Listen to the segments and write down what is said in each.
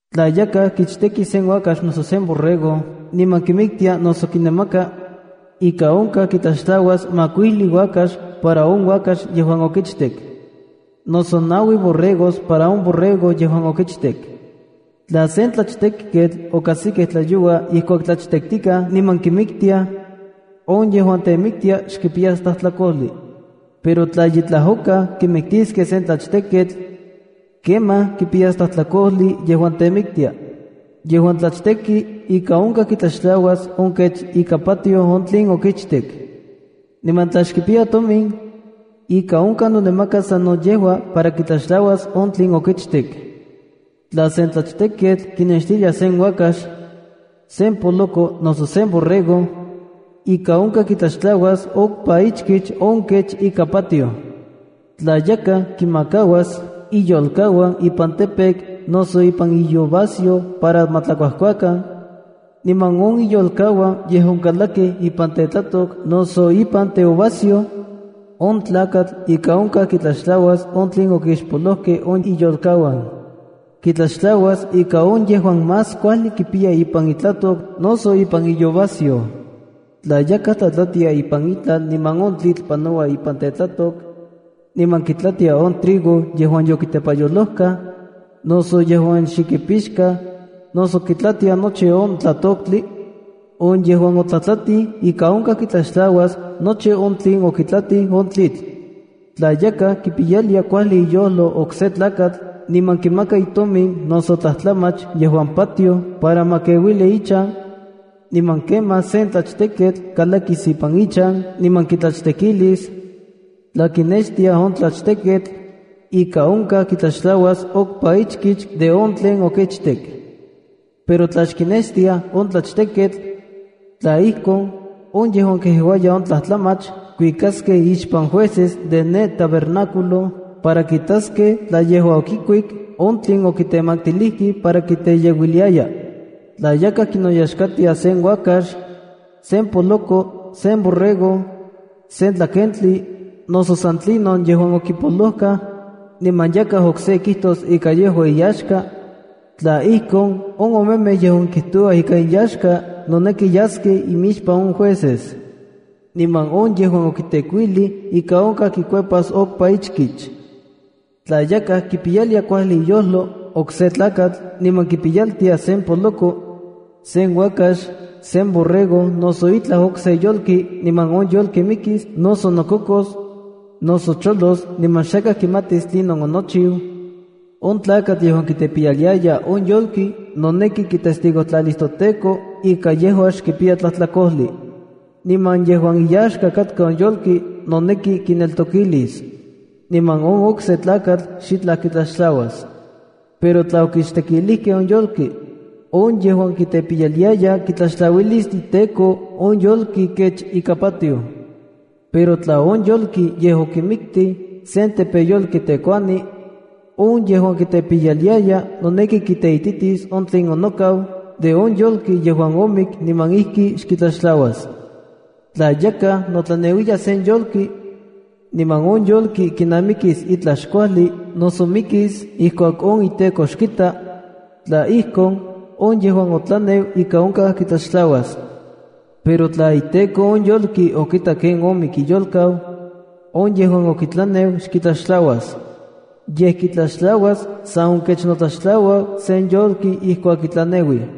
’Tla yakaj kichteki sen uakax noso sen borrego niman kimiktia noso kinamaka, ika onkaj kitlaxtlauas makuili uakax para on uakax yejuan okichtek, noso naui borregos para on borrego yejuan okichtek. ’Tla sen tlachtejketl okajsikej tlayoua ijkuak tlachtektikaj niman kimiktiaj, on yejuan temiktia xkipiyas tlajtlakojli. Pero tla ye tlajokaj kimiktiskej sen tlachtejketl, kemaj kipiyas tlajtlakojli yejuan temiktia. ’Yejuan tlachteki ika onkaj kitlaxtlauas on kech ika patioj on tlen okichtek. Niman tla xkipiya tomin, ika onkaj nonamakas sano yejua para kitlaxtlauas on tlen okichtek. ’Tla sen tlachteketl kinextiliaj sen uakax, sen poloko, noso sen borrego, ika onkaj kitlaxtlauas okpa ichkich de on kech ika patioj. ’Tla yakaj kinmakauas iyolkauan ipan campo noso ipan iuvasyoj para ma tlakuajkuakan, niman on iyolkauan yej onkalakij ipan tetlatok noso ipan teuvasyoj, on tlakatl ika onkaj kitlaxtlauas on tlen okixpolojkej on iyolkauan. Kitlaxtlauas ika on yejuan más kuajli kipiya ipan itlatok noso ipan iuvasyoj. ’Tla yakaj tlatlatia ipan itlal niman on tlitl panoua ipan tetlatok, niman kitlatia on trigo yejuan yokitepayolojkaj, noso yejuan xe kipixkaj noso kitlatia nochi on tlatoktli, on yejuan otlatlatij ika onkaj kitlaxtlauas nochi on tlen okitlatij on tlitl. ’Tla yakaj kipiyalia kuajli iyojlo okse tlakatl niman kimaka itomin noso tlajtlamach yejuan patioj para ma keuili ichan, niman kemaj sen tlachteketl kalakis ipan ichan niman kitlachtekilis, tla kinextiaj on tlachteketl, ika onkaj kitlaxtlauas okpa ichkich de on tlen okichtek. Pero tla xkinextiaj on tlachteketl, tla ijkon, on yejuan keuaya on tlajtlamach kuikaskej imixpan jueces de ne tabernáculo para kitaskej tla yejua okikuik on tlen okimaktilijkej para kiteyeuiliaya. ’Tla yakaj kinoyaxkatia sen uakax, sen poloko, sen borrego, sen tlakentli, noso san tlinon yejuan okipolojkaj, niman yakaj okse kijtos ika yejua iyaxka, tla ijkon, on omemej yejuan kijtouaj ika inyaxka noneki yaskej imixpan on jueces. Niman on yejuan okitekuilij ika onkaj kikuepas okpa ichkich. ’Tla yakaj kipiyalia kuajli iyojlo okse tlakatl niman kipiyaltia sen poloko, sen uakax, sen borrego noso itlaj okse yolki niman on yolki mikis, noso nokokos, noso cholos niman xakaj kimatis tlinon onochiu, on tlakatl yejuan kitepiyaliaya on yolki noneki kitestigojtlalis toTEKO ika yejua xkipiya tlajtlakojli. Niman yejuan iyaxka katka on yolki noneki kineltokilis, niman on okse tlakatl xitlaj kitlaxtlauas. Pero tla okichtekilijkej on yolki, on yejuan kitepiyaliaya kitlaxtlauilis iteko on yolki kech ika patioj. Pero tla on yolki yej okimiktij sen tepeyolki tekuani, on yejuan kitepiyaliaya noneki kiteititis on tlen onokau de on yolki yejuan omik niman ijki xkitlaxtlauas. ’Tla yakaj notlaneuiya sen yolki, niman on yolki kinamikis itlaj xkuajli noso mikis ijkuak on iteko xkita, tla ijkon, on yejuan otlaneu ika onkaj kitlaxtlauas. Pero tla iteko on yolki okitak ken omik iyolkau, on yejuan okitlaneu xkitlaxtlauas. Yej kitlaxtlauas san on kech notlaxtlaua sen yolki ijkuak kitlaneuij.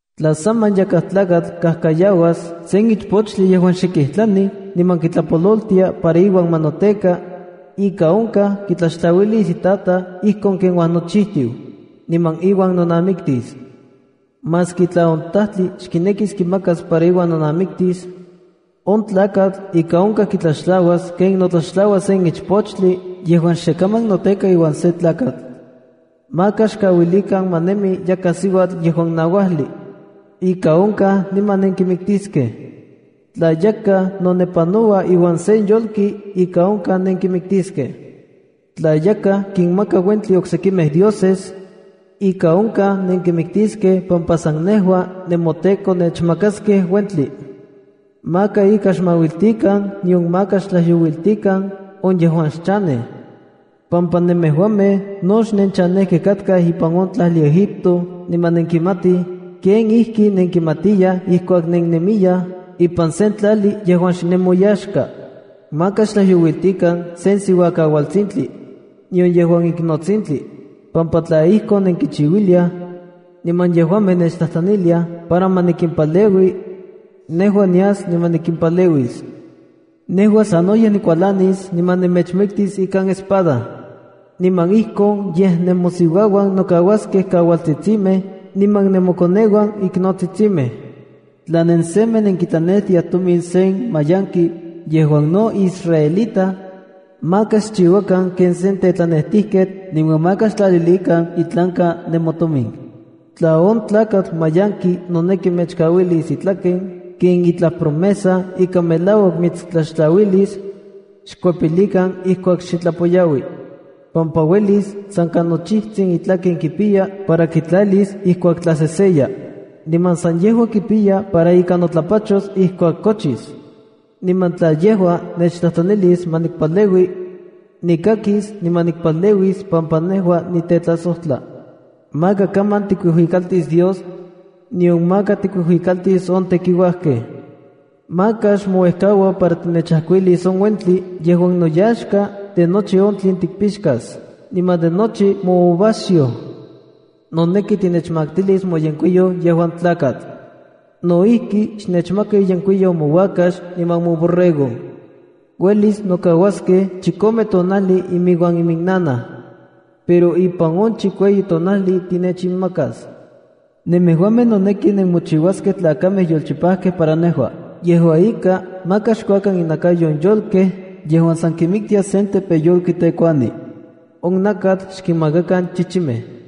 ’Tla saman yakaj tlakatl kikajkayaua sen ichpochtli yejuan xe kijtlanij niman kitlapololtia para iuan ma noteka, ika onkaj kitlaxtlauilis itataj ijkon ken uajnochijtiu, niman iuan nonamiktis. Maski tla on tajtli xkinekis kimakas para iuan nonamiktis, on tlakatl ika onkaj kitlaxtlauas ken notlaxtlaua sen ichpochtli yejuan xe kaman noteka iuan se tlakatl. ’Maka xkauilikan ma nemi yakaj siuatl yejuan nauajli. Ika onkaj niman nenkimiktiskej. ’Tla yakaj nonepanoua iuan sen yolki, ika onkaj nenkimikitiskej. ’Tla yakaj kinmaka uentli oksekimej dioses, ika onkaj nenkimiktiskej pampa san nejua, nemoTEKO nennechmakaskej uentli. ’Maka ika xmauiltikan nion maka xtlajyouiltikan on yejuan xchanej, pampa nemejuamej no xnenchanejkej katkaj ipan on tlajli Egipto niman nenkimatij kenijkinenkimatiyaj ijkuak nennemiyaj ipan sen tlajli yejuan xnemoyaxka. ’Maka xtlajyouiltikan sen siuakaualtsintli, nion yejuan iknotsintli, pampa tla ijkon nenkinchiuiliaj, niman yejuamej nechtlajtlaniliaj para ma nikimpaleui, nejua nias niman nikimpaleuis. Nejua sanoyej nikualanis niman nemechmiktis ikan espada, niman ijkon yej nemosiuauan nokauaskej kaualtsitsimej niman nemokoneuan iknotsitsimej. ’Tla nensemej nenkitlanejtiaj tomin sen mayanki yejuan no israelita, maka xchiuakan ken sen tetlanejtijketl niman maka xtlalilikan itlanka nemotomin. Tla on tlakatl mayanki noneki mechkauilis itlaken ken itlaj promesa ika melauak mitstlaxtlauilis, xkuepilikan ijkuak xe tlapoyaui, pampa uelis san ka nochijtsin itlaken kipiya para kitlalis ijkuak tlaseseya. Niman san yejua kipiya para ika notlapachos ijkuak kochis. Niman tla yejua nechtlajtlanis ma nikpaleui, nikakis niman nikpaleuis pampa nejua nitetlasojtla. ’Maka kaman tikuijuikaltis Dios, nion maka tikinuijuikaltis on tekiuajkej. ’Maka xmouejkaua para tinechajkuilis on uentli yejuan noyaxka de nochi on tlen tikkipixkas niman de nochi mouvasayoj. “Noneki tinechmaktilis moyenkuiyou yejuan tlakatl. No ijki, xnechmaka iyenkuiyou mouakax niman moborrego. Uelis nokauaskej chikome tonajli iuan iminnanaj, pero ipan on chikueyi tonajli tinechinmakas. ’Nemejuamej noneki nenmochiuaskej tlakamej yolchipajkej para nejua. ’Yejua ika, maka xkuakan inakayo on yolkej yejuan san kimiktia sen tekuani yejuan tepeyolki. On nakatl xkinmakakan chichimej.